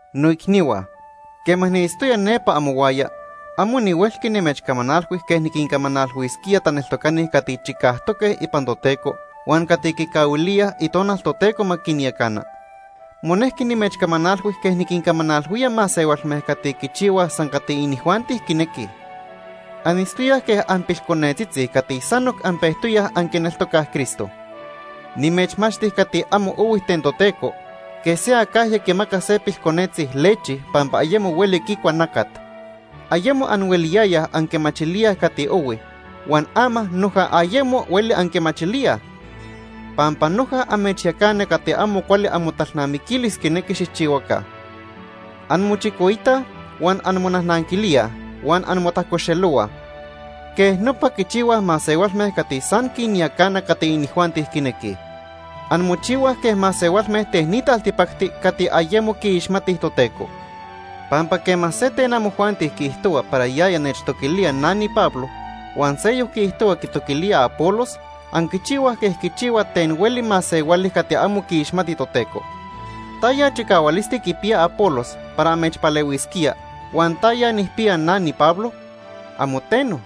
Noicnihua, quema niitztoya nepa amohuaya, amo nihuelqui nimechcamanalhui quej niquincamanalhuisquía taneltocani cati chicajtoque ipan Toteco huan cati quicahuilíaj Itonal Toteco ma quinyacana. Monejqui nimechcamanalhui quej niquincamanalhuía masehualme cati quichihuaj san cati inijuanti quinequij. Anitztoyaj quej anpilconetzitzi cati sanoc anpejtoyaj anquineltocaj Cristo. Nimechmachti cati amo ohui ten Toteco, quej se acajya quimaca se pilconetzi lechi pampa ayemo hueli quicua nacat. Ayemo anhueliyayaj anquimachilíaj cati ohui, huan ama noja ayemo hueli anquimachilíaj, pampa noja amechyacana cati amo cuali amotalnamiquilis quinequi xijchihuaca. Anmochicoitaj huan anmonajnanquilíaj huan anmotajcoxelohuaj. Quej nopa quichihuaj masehualme cati san quinyacana cati inijuanti quinequij. Anmochihuaj quej masehualme ten ni taltipacti cati ayemo quiixmatij Toteco. Pampa quema se ten amojuanti quiijtohua para yaya nechtoquilía na niPablo, huan seyoc quiijtohua quitoquilía Apolos, anquichihuaj quej quichihua ten hueli masehuali cati amo quiixmati Toteco. ¿Taya chicahualisti quipiya Apolos para amechpalehuisquía huan taya nijpiya na, niPablo? ¡Amo teno!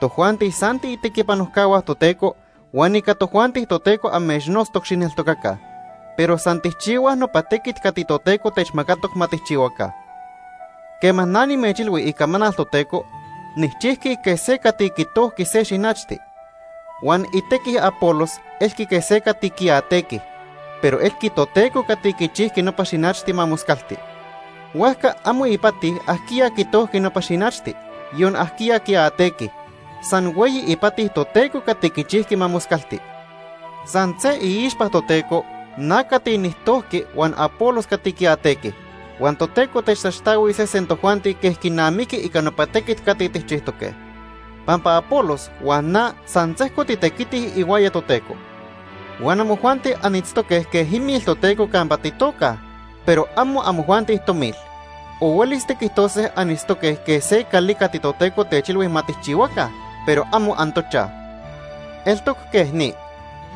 Tojuanti san tiitequipanojcahua Toteco huan ica tojuanti Toteco amechnotztoc xijneltocaca, pero san tijchihuaj nopa tequit cati Toteco techmacatoc ma tijchihuaca. Quema na nimechilhui icamanal Toteco, nijchijqui quej se cati quitojqui se xinachti, huan itequi Apolos elqui quej se cati quiatequi, pero elqui Toteco cati quichijqui nopa xinachti ma moscalti. Huajca amo ipati ajquiya quitojqui nopa xinachti, yon ajquiya quiatequi, san hueyi ipati Toteco cati quichijqui ma moscalti. San se iixpa Toteco na cati nijtojqui huan Apolos cati quiatequi, huan Toteco techtaxtahuis sesen tojuanti quej quinamiqui ica nopa tequit cati tijchijtoque. Pampa Apolos huan na san sejco titequitij ihuaya Toteco. Huan amojuanti anitztoque quej imil Toteco campa titocaj, pero amo amojuanti tomil. O huelis tiquijtose anitztoque quej se cali cati Toteco techilhui ma tijchihuaca, pero amo antochaj. Eltoc quej ni.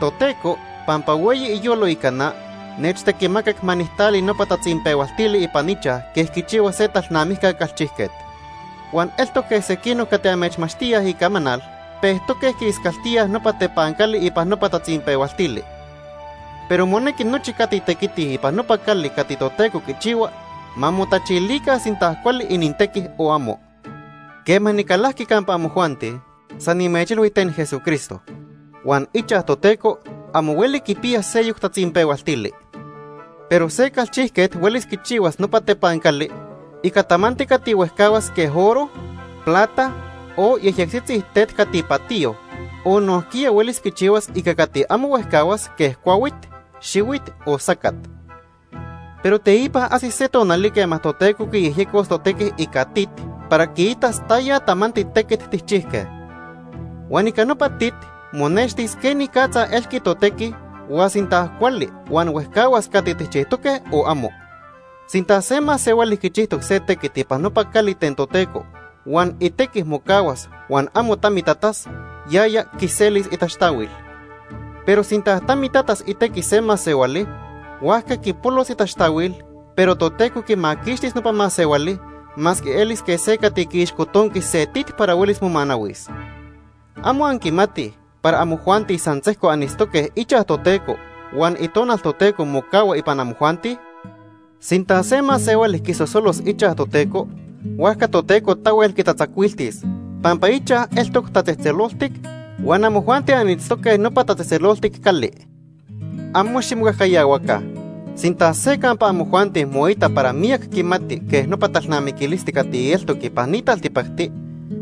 Toteco, pampa hueyi iyolo ica na, nechtequimacac ma nijtali nopa tatzinpehualtili ipan ichaj quej quichihua se talnamijca calchijquet. Huan eltoc quej sequinoc cati amechmachtíaj Icamanal pejtoque quiiscaltíaj nopa tepancali ipan nopa tatzinpehualtili. Pero monequi nochi cati tequitij ipan nopa cali cati Toteco quichihua, ma motachilica sinta cuali inintequi o amo. Quema nicalajqui campa amojuanti, san nimechilhui ten Jesucristo. Huan ichaj Toteco amo hueli quipiya seyoc tatzinpehualtili. Pero se calchijquet huelis quichihuas nopa tepancali ica tamanti cati huejcahuas quej oro, plata, o yejyectzitzi tet cati patiyo, o nojquiya huelis quichihuas ica cati amo huejcahuas quej cuahuit, xihuit o sacat. Pero teipa ajsis se tonali quema Toteco quiyejyecos totequi ica tit para quiitas taya tamanti tequit tijchijque. Huan ica nopa tit monextis quenicatza elqui totequi huan sinta cuali huan huejcahuas cati tijchijtoque o amo. Sinta se masehuali quichijtoc se tequit ipan nopa cali ten Toteco huan itequi mocahuas huan amo tamitatas, yaya quiselis itaxtahuil. Pero sinta tamitatas itequi se masehuali, huajca quipolos itaxtahuil, pero Toteco quimaquixtis nopa masehuali masque elis quej se cati quiixcotonqui se tit para huelis momanahuis. ¿Amo anquimatij para amojuanti san sejco anitztoque ichaj Toteco huan Itonal Toteco mocahua ipan amojuanti? Sinta se masehuali quisosolos ichaj Toteco, huajca Toteco tahuel quitatzacuiltis, pampa ichaj eltoc tatzejtzeloltic huan amojuanti anitztoque nopa tatzejtzeloltic cali. Amo ximocajcayahuaca. Sinta se campa amojuanti moita para miyac quimati quej nopa talnamiquilisti cati eltoc ipan ni taltipacti,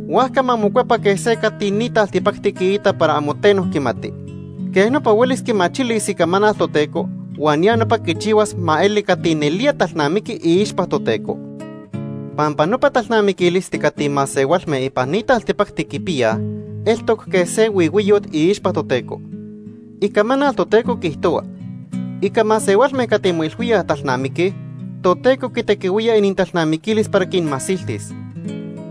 huajca ma mocuepa quej se cati ni taltipacti quiita para amo teno quimati. Quej nopa huelis quimachilis Icamanal Toteco huan ya nopa quichihuas ma eli cati nelía talnamiqui iixpa Toteco. Pampa nopa talnamiquilisti cati masehualme ipan ni taltipacti quipiyaj eltoc quej se huihuiyot iixpa Toteco. Icamanal Toteco quiijtohua: “Ica masehualme cati moilhuíaj talnamiquij, Toteco quitequihuía inintalnamiquilis para quinmasiltis.”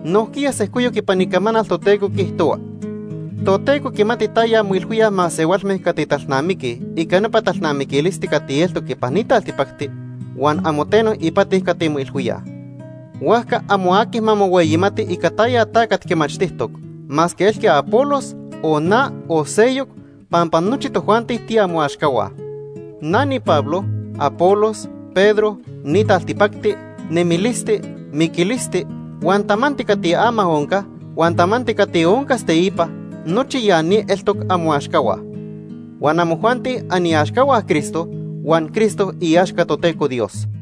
Nojquiya sejcoyoc ipan Icamanal Toteco quiijtohua: “Toteco quimati taya moilhuíaj masehualme cati talnamiquij ica nopa talnamiquilisti cati eltoc ipan ni taltipacti, huan amo teno ipati cati moilhuíaj.” Huajca amo aqui ma mohueyimati ica taya tacat quimachtijtoc, masque elqui Apolos, o na, o seyoc, pampa nochi tojuanti tiamoaxcahua. Na niPablo, Apolos, Pedro, ni taltipacti, nemilisti, miquilisti, huan tamanti cati ama onca, huan tamanti cati oncas teipa; nochi ya ni eltoc amoaxcahua. Huan amojuanti aniaxcahua Cristo huan Cristo iaxca Toteco Dios.